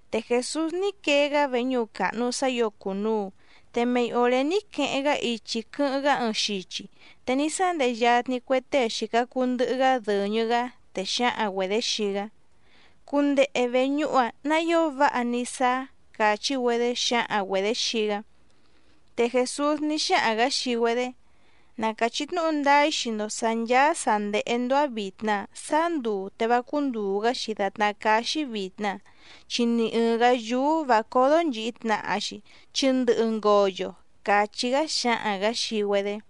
Te Jèsús ní quee‑gá veñúhu càhnu sá ǐo cùnuu, te mei òré ní queheⁿ‑gá ichi quɨ́hɨ́ⁿ‑gá ɨɨⁿ xichi, te ní sándehe yatni cue tée xìca cuu ndɨhɨ‑gá dɨ̀ñɨ‑gá, te xǎhaⁿ‑güedě xii‑gá: —Cundehe vèñúhu‑a nǎ ío váha ní sáá —càchí‑güedé xǎhaⁿ‑güedě xii‑gá. Te Jèsús ní xáhaⁿ‑gǎ xii‑güedé: —Na càchí tnúhu ndáá‑í xii‑ndo sǎ ncháá sǎ ndéhé‑ndó‑á vìtna saá nduu te vá cúndùu‑gá‑xi dàtná cáá‑xí vìtna, chi ni ɨ̀ɨⁿ‑gá yúú vǎ códó nchìhi tnaha‑xi chi ndɨhɨ ngoyo —càchí‑gá xǎhaⁿ‑gǎ xii‑güedé.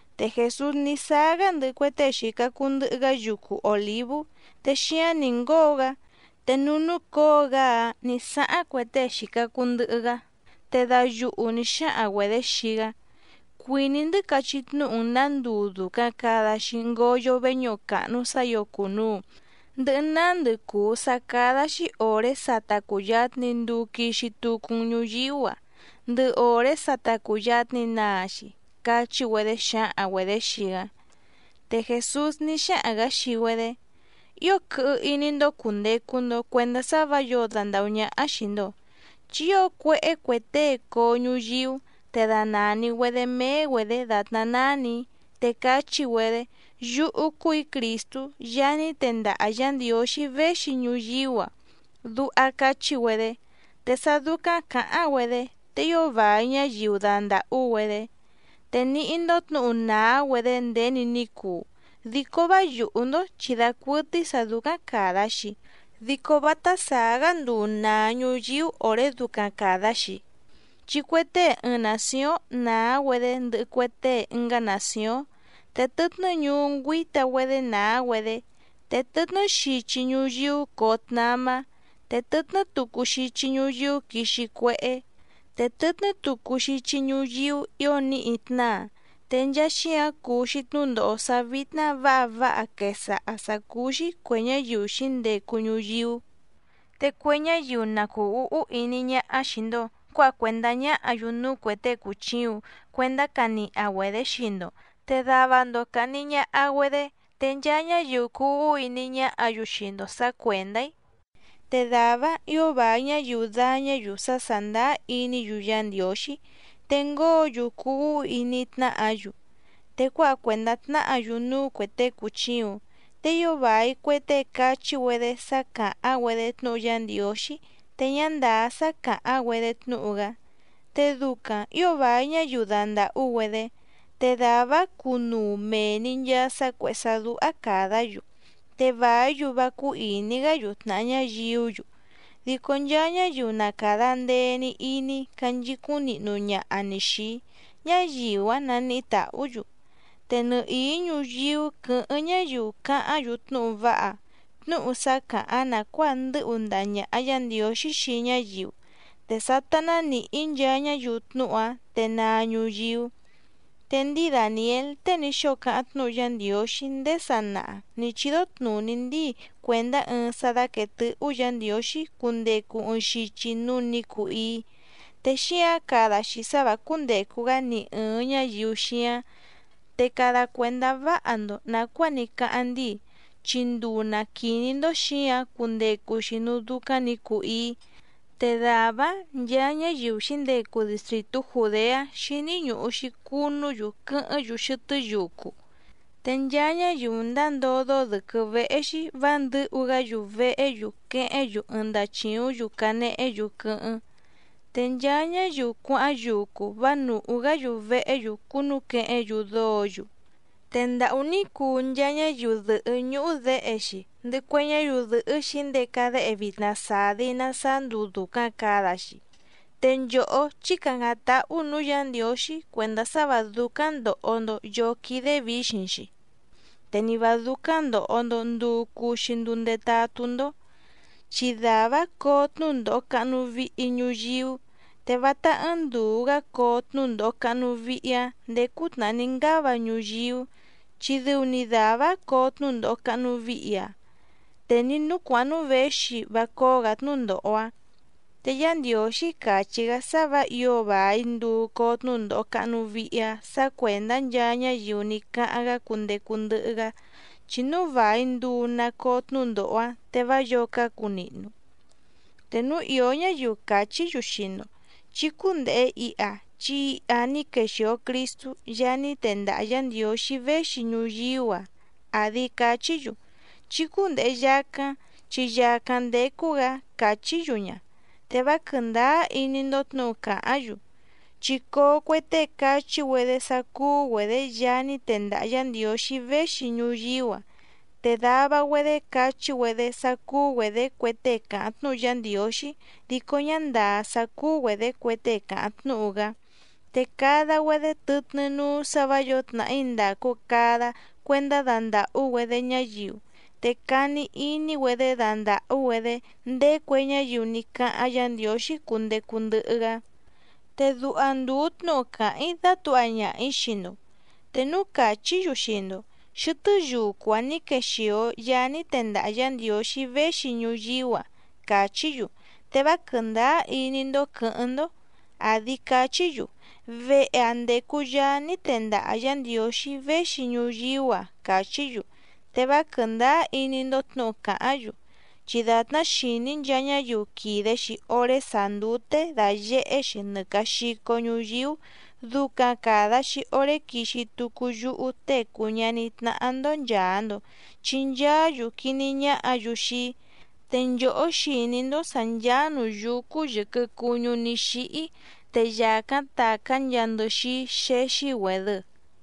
Te Jèsús ní sáá‑gá ndɨhɨ cue tée xìca cuu ndɨhɨ‑gá yucu Òlívú, te xíáⁿ nǐ ngóo‑gá te núú núcǒo‑gá‑áⁿ nǐ sáháⁿ cue tée xìca cuu ndɨhɨ‑gá, te dayuhu nǐ xáhaⁿ‑güedě xii‑gá: —Cuìní‑ndɨ́ cachí tnúhu‑n nǎ nduu dùcaⁿ cada‑xi ngoyo veñúhu càhnu sá ǐo cùnuu, ndɨhɨ nándɨ cùu sá cádá‑xí òré sa ta cùyatni nduu quixi tucu‑n ñuyíú‑a, ndɨhɨ òré sa ta cùyatni naa‑xi —cachí‑güedé xǎhaⁿ‑güedě xii‑gá. Te Jèsús ní xáhaⁿ‑gǎ xii‑güedé: —Ío quɨhɨ iní‑ndó cùndecu‑ndo cuendá sá vǎ yǒo dandàhú ñáhá xìi‑ndo. Chi ío cuéhé cue tée coo ñuyíú, te danàni‑güedé méé‑güedě dàtná nánì‑í, te cachí‑güedé: “Yúhú cúù‑í Crìstú Yaá ní tendaha Yǎ Ndiǒxí véxi ñuyíú‑a”, duha cachí‑güedé. Te sá dúcáⁿ cǎháⁿ‑güedé te ío vài ñáyiu dandàhú‑güedé. Te níhí‑ndó tnǔhu nàá‑güedé nděni ní cuu, dico vá yùhú‑ndó chi dacuɨtɨ́í sǎ dúcáⁿ càda‑xi, dico vátá sàá‑gá nduu nàa ñuyíú òré ducaⁿ càda‑xi. Chi cue tée ɨɨⁿ nàcióⁿ nàá‑güedé ndɨhɨ cue tée ɨngá nàcióⁿ, te tɨtnɨ́ ñuú ngüíta‑güedé nàá‑güedé, te tɨtnɨ́ xichi ñuyíú coo tnamá, te tɨtnɨ́ tucu xichi ñuyíú quixi cuéhé, te tɨtnɨ́ tucu xichi ñuyíú ǐo níhi tnáa. Te nchaa xíǎⁿ cuu‑xi tnúndòho sá vítná vǎha váha quèsaha sá cúú‑xí cuè ñáyiu xǐndecu ñuyíú. ’Te cue ñáyiu na cùu úhú iní ñáhá xìi‑ndo cuáha cuèndá ñáhǎ‑yu núú cuè tée cùchiuⁿ cuendá caniha‑güedě xii‑ndo, te dava‑ndo càhni ñaha‑güedé, te nchaa ñáyiu cuu úhú iní ñáhǎ‑yu xii‑ndo sǎ cuèndá‑í. Te dàvá‑áⁿ ǐo vài ñáyiu dàñá‑yu sá sàndáá iní‑yu Yá Ndiǒxí, te ngóo‑yu cuu úhú iní tnáhǎ‑yu, te cuáha cuèndá tnáhǎ‑yu núú cuè tée cùchiuⁿ. Te ío vài cue tée cachí‑güedé sá càháⁿ‑güedé tnúhu Yá Ndiǒxí te ñá ndàá sá càháⁿ‑güedé tnúhu‑gá, te ducaⁿ ǐo vài ñáyiu dandàhú‑güedé. Te dàvá‑áⁿ cunuu mèe‑ni nchaa sá cuèhé sá dúhá càdá‑yu, te vàí‑yu vá cúú ìní‑gá‑yu tnàha ñáyiú‑yu. Dico nchaa ñáyiu na càda ndee‑ni iní canchicúⁿ nihnu ñaha‑ni xìi‑í, ñáyiu‑áⁿ naníhí tàhú‑yu. Te nɨhìí ñuyíú quɨ̌hɨ́ⁿ ñáyiu cáháⁿ‑yu tnúhu váha, tnúhu sá càháⁿ nàcuáa ndɨ́hu ndaha ñàha Yá Ndiǒxí xii ñáyiu, te sátá ná nìhí nchaa ñáyiu tnúhu‑áⁿ te naa ñuyíú. ’Te ndíi Dàniél tée ní xóo cáháⁿ tnúhu Yá Ndiǒxí ndéé sanaha nǐ chídó tnùní ndíi cuèndá ɨɨⁿ sá dáquèe tɨhú Yǎ Ndiǒxí cundecu ɨɨⁿ xichi núú nǐ cuu íí, te xíǎⁿ cada‑xi sá vǎ cúndècu‑gá ni ɨ̀ɨⁿ ñáyiu xíáⁿ. Te cada cuèndá váha‑ndo nàcuáa ní cáháⁿ ndíi, chi nduu na quìní‑ndó xǐǎⁿ cundecu‑xi núú dúcáⁿ nǐ cuu íí, te dàvá‑áⁿ nchaa ñáyiu xǐndecu distrìtú Jùdeá xíní ñùhu‑xi cunú‑yu quɨ́hɨ́ⁿ‑yu xɨtɨ́ yucu. Te nchaa ñáyiu ndáa ndódó dɨ̌quɨ́ véhé‑xí vǎ ndɨ̌hu‑gá‑yu vehé‑yu quehéⁿ‑yu ɨɨⁿ ndachìúⁿ‑yu canehé‑yu quɨ́hɨ́ⁿ. Te nchaa ñáyiu cuáháⁿ yucu vá nùhú‑gá‑yu vehé‑yu cúnúquehéⁿ‑yu dóǒ‑yu. ¡Te ndàhú ní cuu nchaa ñáyiu dɨ̀hɨ́ ñúhú děhe‑xi, ndɨhɨ cue ñáyiu dɨ̀hɨ́ xǐndeca déhe vitna sàdi na saá nduu dùcaⁿ cada‑xi! Te nchòhó, chí càcáⁿ táhú nǔú Yǎ Ndiǒxí cuèndá sá vǎ dúcáⁿ ndòho‑ndo yóó quídé vǐxiⁿ‑xi, te ni vǎ dúcáⁿ ndòho‑ndo nduu cuu‑xi nduu ndetatú‑ndó. Chi dàvá‑áⁿ coo tnúndòho cahnu vihi ñuyíú, te vátá ɨ́ɨ́ⁿ ndùu‑gá coo tnúndòho cahnu vihi‑áⁿ ndèé cútnàhá ní ngáva ñuyíú, chi dɨu‑ni dàvá‑áⁿ coo tnúndòho cahnu vihi‑áⁿ, te ni nǔú cuàháⁿ núú věxi vá cóó‑gǎ tnúndòho‑áⁿ. Te Yá Ndiǒxí càchí‑gá sá vǎ ǐo vài nduu coo tnúndòho cahnu vihi‑áⁿ sǎ cuèndá nchaa ñáyiu ní cáháⁿ‑gá cundecu ndɨhɨ‑gá. Chi núu vài nduu na coo tnúndòho‑áⁿ te vá yǒo cácu nihnu. ’Te núu ìó ñáyiu càchí‑yu xii‑ndo: “Chí cúndèhe iha, chi iha ní quexìo Cristú Yaá ní tendaha Yǎ Ndiǒxí véxi ñuyíú‑a”, àdi cachí‑yu: “Chí cúndèhe yacáⁿ chi yàcáⁿ ndécú‑gǎ”, càchí‑yu ña. Te vá quɨ̀ndáá iní‑ndó tnǔhu càháⁿ‑yu. Chi coo cue tée cachí‑güedé sá cúú‑güedě Yaá ní tendaha Yǎ Ndiǒxí véxi ñuyíú‑a, te dava‑güedé cachí‑güedé sá cúú‑güedě cue tée càháⁿ tnúhu Yá Ndiǒxí dico ñá ndàá sá cúú‑güedě cue tée càháⁿ tnúhu‑gá, te cada‑güedé tɨtnɨ́ núú sǎ vǎ yǒo tnàhí ndàcu cada cuendá dandàhú‑güedé ñáyiu. Te cani iní‑güedé dandàhú‑güedé ndéé cue ñáyiu ní cáháⁿ Yǎ Ndiǒxí cundecu ndɨhɨ‑gá. Te duha ndùu tnúhu càháⁿ‑í dátǔha ñaha‑ǐ xii‑ndo. Te núu càchí‑yu xii‑ndo: “Xɨtɨ́ yucu‑ǎⁿ ní quexìo Yaá ní tendaha Yǎ Ndiǒxí véxi ñuyíú‑a”, càchí‑yu. Te vá quɨ̀ndáá iní‑ndó quɨ̌hɨ́ⁿ‑ndó, àdi cachí‑yu: “Vehe‑ǎⁿ ndécú Yàá ní tendaha Yǎ Ndiǒxí véxi ñuyíú‑a”, càchí‑yu. Te vá quɨ̀ndáá iní‑ndó tnǔhu càháⁿ‑yu. Chi dàtná xìní nchaa ñáyiu quìde‑xi oré sàá ndúté dàyehé‑xi nɨ càa xico ñuyíú ducaⁿ càda‑xi oré quixi tucu yúhú Tée cùu ñaní tnáhá‑ndó nchàa‑ndo chi nchaá‑yu quiní ñáhǎ‑yu xii‑í. Te nchòhó xìní‑ndó sǎ ncháá nǔú yúcú yɨ̀quɨ cuñú ní xíhí te yàcáⁿ tàcá nchaa ndɨxíí xéxí‑güèdɨ.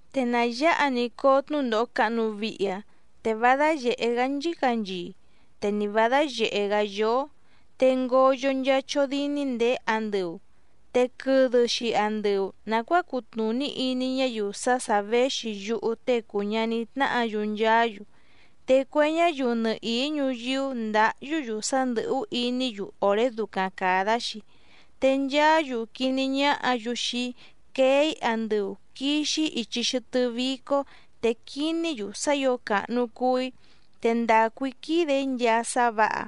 ’Te na yǎha‑ni coo tnúndòho cahnu vihi‑áⁿ, te vá dáyèhé‑gá nchícanchii, te ni vǎ dáyèhé‑gá yóó, te ngoyo nchaa chódíní ndèé andɨu, te quɨdɨ‑xi andɨu nàcuáa cutnùní iní ñáyiu sá sà véxi yúhú Tée cùu ñaní tnáhǎ‑yu nchaá‑yu. Te cue ñáyiu nɨhìí ñuyíú ndǎhyú‑yu sá ndɨ̀hú iní‑yu òré ducaⁿ càda‑xi, te nchaá‑yu quiní ñáhǎ‑yu xii‑í quee‑í andɨu quìxi‑í ichi xɨtɨ́ vícó, te quiní‑yu sá ǐo càhnu cuu‑í, te quìde‑í nchaa sá vǎha.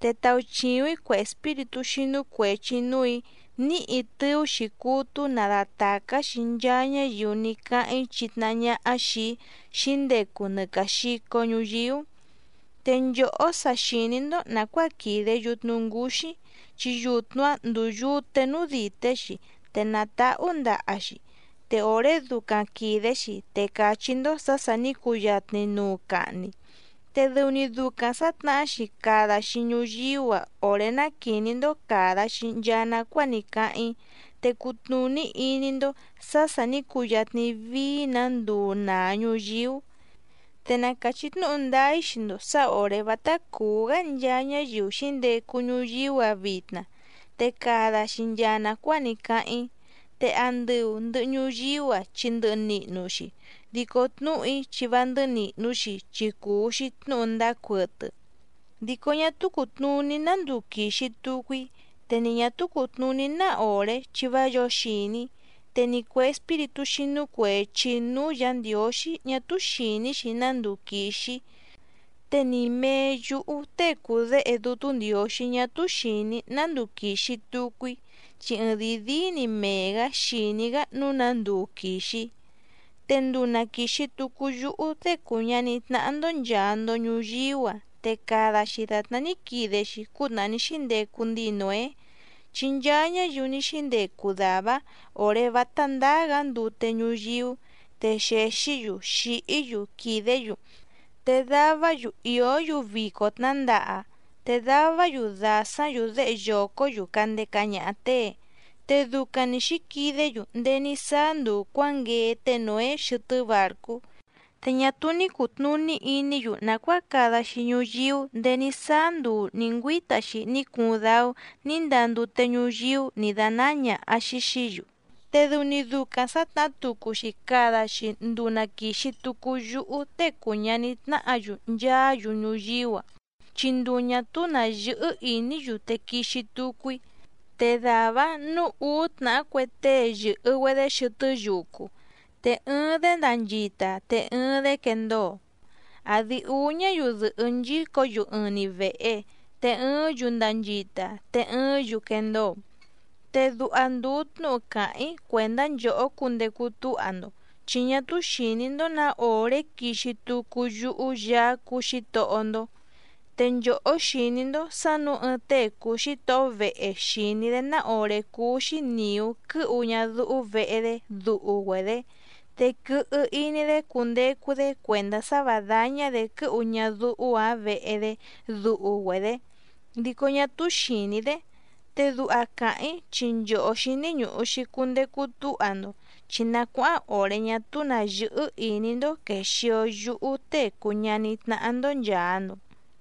Te tauchìuⁿ‑í cue espíritú xínú cuèchi núù‑í níhi tɨú‑xi cútú nadatàcá‑xi nchaa ñáyiu ní cáháⁿ‑í chitnahá ñáhá xìi‑í xǐndecu nɨ càa xico ñuyíú. ’Te nchòhó sa xìní‑ndó nàcuáa quìde yutnu ngúxí, chi yutnu‑áⁿ ndúú yùte núú dìté‑xi te nàtáhú ndaha‑xi. Te òré ducaⁿ quìde‑xi te càchí‑ndó sǎ sà ní cuyatni nuu cahni. Te dɨu‑ni ducaⁿ sǎtnahá‑xi cada‑xi ñuyíú‑a òré ná quìní‑ndó càda‑xi nchaa nacuáa ní cáháⁿ‑í, te cutnùní iní‑ndó sǎ sà ní cuyatni vií‑nǎ nduu nàa ñuyíú. Te na càchí tnúhu ndáá‑í xii‑ndo sǎ òré vátá cùú‑gá nchaa ñáyiu xǐndecu ñuyíú‑a vitna, te cada‑xi nchaa nàcuáa ní cáháⁿ‑í. Te andɨu ndɨ̀hɨ ñuyíú‑a chi ndɨhɨ nihnu‑xi, dico tnúhu‑í chi vá ndɨ́hɨ́ nìhnu‑xi chi cùu‑xi tnúhu ndáá cuɨtɨ. ’Dico ñá túú cùtnuní ná nduu quìxi tucu‑í, te ni ñà túú cùtnuní ná òré chi vá yǒo xìní, te ni cuè espíritú xínú cuèchi núú Yǎ Ndiǒxí ñá túú xìní‑xi ná nduu quìxi‑í, te ni mèe yúhú Tée cùu Déhe Dútú Ndiǒxí ñá túú xìní‑í ná nduu quìxi tucu‑í, chi ɨɨⁿdìi díí‑ni mee‑gǎ xìní‑gá nǔu ná nduu quìxi‑í. ’Te nduu na quìxi tucu yúhú Tée cùu ñaní tnáhá‑ndó nchàa‑ndo ñuyíú‑a te cada‑xi dàtná ní quide‑xi cútnàhá ní xíndecu ndíi Nǒé. Chi nchaa ñáyiu ní xíndecu dàvá‑áⁿ òré vátá ndáá‑gǎ ndute ñuyíú, te xèxí‑yu xìhí‑yu quìdé‑yu, te davá‑yu ìó‑yu vico tnǎndaha, te davá‑yu dàsáⁿ‑yu déhe yòcó‑yu candeca ñaha těe, te ducaⁿ‑ni xǐquidé‑yu ndéé ní sáá nduu cuǎnguee té Nǒé xɨtɨ́ bàrcú. Te ñá túú ní cùtnuní iní‑yu nàcuáa cada‑xi ñuyíú ndèé ní sáá nduu nǐ ngüíta‑xi ní cuuⁿ dáú nǐ ndaa ndute ñuyíú nǐ dánáá ñàha‑xi xií‑yu. Te dɨu‑ni ducaⁿ sǎtnahá tucu‑xi cada‑xi nduu na quìxi tucu yúhú Tée cùu ñaní tnáhǎ‑yu nchaá‑yu ñuyíú‑a, chi nduu ñà túú nǎ yɨ́hɨ́ ìní‑yu te quixi tucu‑í. Te dàvá‑áⁿ nǔu úú tnàhá cue tée yɨ̀hɨ‑güedé xɨtɨ́ yucu, te ɨɨⁿ‑dé ndanchita te ɨɨⁿ‑dé quendóo. Àdi úú ñáyiu dɨ̀hɨ́ nchícǒ‑yu ɨɨⁿ‑ni vèhe, te ɨɨ́ⁿ‑yu ndanchita te ɨɨ́ⁿ‑yu quendóo. ’Te duha ndùu tnúhu càháⁿ‑í cuèndá nchòhó cundecu túha‑ndo, chi ñá túú xìní‑ndó nǎ òré quixi tucu yúhú Yaá cúú Xǐtohó‑ndó. Te nchòhó xìní‑ndó sǎ nǔu ɨɨⁿ tée cùu xítohó vehe xìní‑dé ná òré cúú‑xí nìú quɨ́hu ñadúhú vehe‑dé duhu‑güedě, te quɨhɨ iní‑dé cundecu‑dé cuèndá sá vǎ dáñá‑dě quɨ́hu ñadúhú‑ǎⁿ vehe‑dé duhu‑güedě, dico ñá túú xìní‑dé. Te duha càháⁿ‑í chi nchòhó xíní ñùhu‑xi cundecu túha‑ndo, chi na cuáháⁿ òré ñá túú nǎ yɨ́hɨ́ ìní‑ndó quèxio yúhú Tée cùu ñaní tnáhá‑ndó nchàa‑ndo.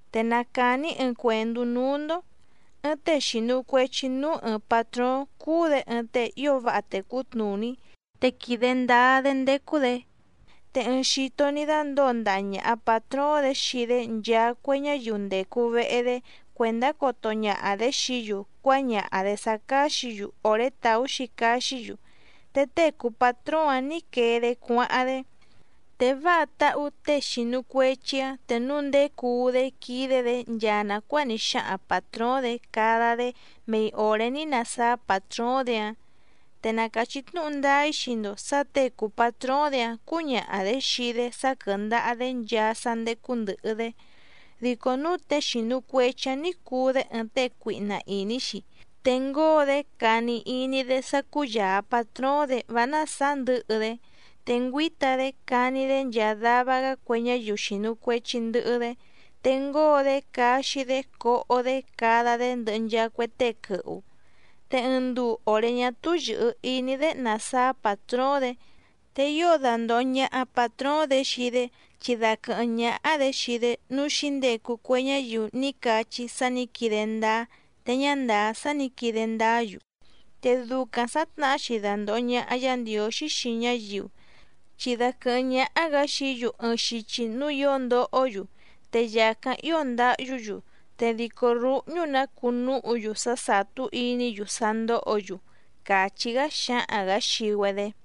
’Te na càni‑í ɨɨⁿ cuèndú núú‑ndó. Ɨɨⁿ tée xìnu cuechi núú ɨɨⁿ pàtróóⁿ cúú‑dě ɨɨⁿ tée ío váha tècú tnùní, te quìde ndáá‑dé ndécú‑dě. Te ɨɨⁿ xito ní dándǒo ndaha ñàha patróóⁿ‑dě xii‑dé nchaa cue ñáyiu ndècu vehe‑dé cuèndá coto ñaha‑dě xií‑yu cuáñaha‑dě sá cáxǐ‑yu òré tàú‑xi caxí‑yu, te tée cùu patróóⁿ‑áⁿ nǐ quee‑dé cuáháⁿ‑dé. Te váha táhú těe xìnu cuechi‑áⁿ te núu nděcuu‑dé quídé‑dě nchaa nàcuáa ní xáhaⁿ pàtróóⁿ‑dě cada‑dé mei òré ní nasáá pàtróóⁿ‑dě‑áⁿ. Te na càchí tnúhu ndáá‑í xii‑ndo sǎ těe cùu patróóⁿ‑dě‑áⁿ cǔñaha‑dě xii‑dé sá quɨ́ndàha‑dé nchaa sá ndécú ndɨ̀hɨ‑dé. Dico núu tée xìnu cuechi‑áⁿ ní cùu‑dé ɨɨⁿ tée cuihna ìní‑xi, te ngóo‑dé cani iní‑dé sá cúyàa patróóⁿ‑dě vá násàá ndɨ̌hɨ‑dé. Te ngüíta‑dé cani‑dé nchaa dava‑gá cue ñáyiu xìnu cuechi ndɨhɨ‑dé, te ngóo‑dé caxi‑dé coho‑dé cada‑dé ndɨhɨ nchaa cue tée quɨhu. Te ɨɨⁿ nduu òré ñá túú yɨ̀hɨ iní‑dé nasáá pàtróóⁿ‑dě, te ío dandòho ñaha patróóⁿ‑dě xii‑dé, chi daquɨ̀hɨ́ⁿ ñáhá‑dě xii‑dé núú xǐndecu cue ñáyiu ní cachí sá nǐ quide ndáá te ñá ndàá sá nǐ quide ndáá‑yu. Te ducaⁿ sǎtnahá‑xi dandòho ñaha Yá Ndiǒxí xii ñáyiu, chi daquɨ̀hɨ́ⁿ ñáhá‑gǎ xií‑yu ɨɨⁿ xichi núú ǐo ndohó‑yu te yàcáⁿ ío ndáhyú‑yu, te dìcó rúhñú‑nǎ cuu núhu‑yu sá sàtú iní‑yu sá ndóhǒ‑yu —càchí‑gá xǎhaⁿ‑gǎ xii‑güedé.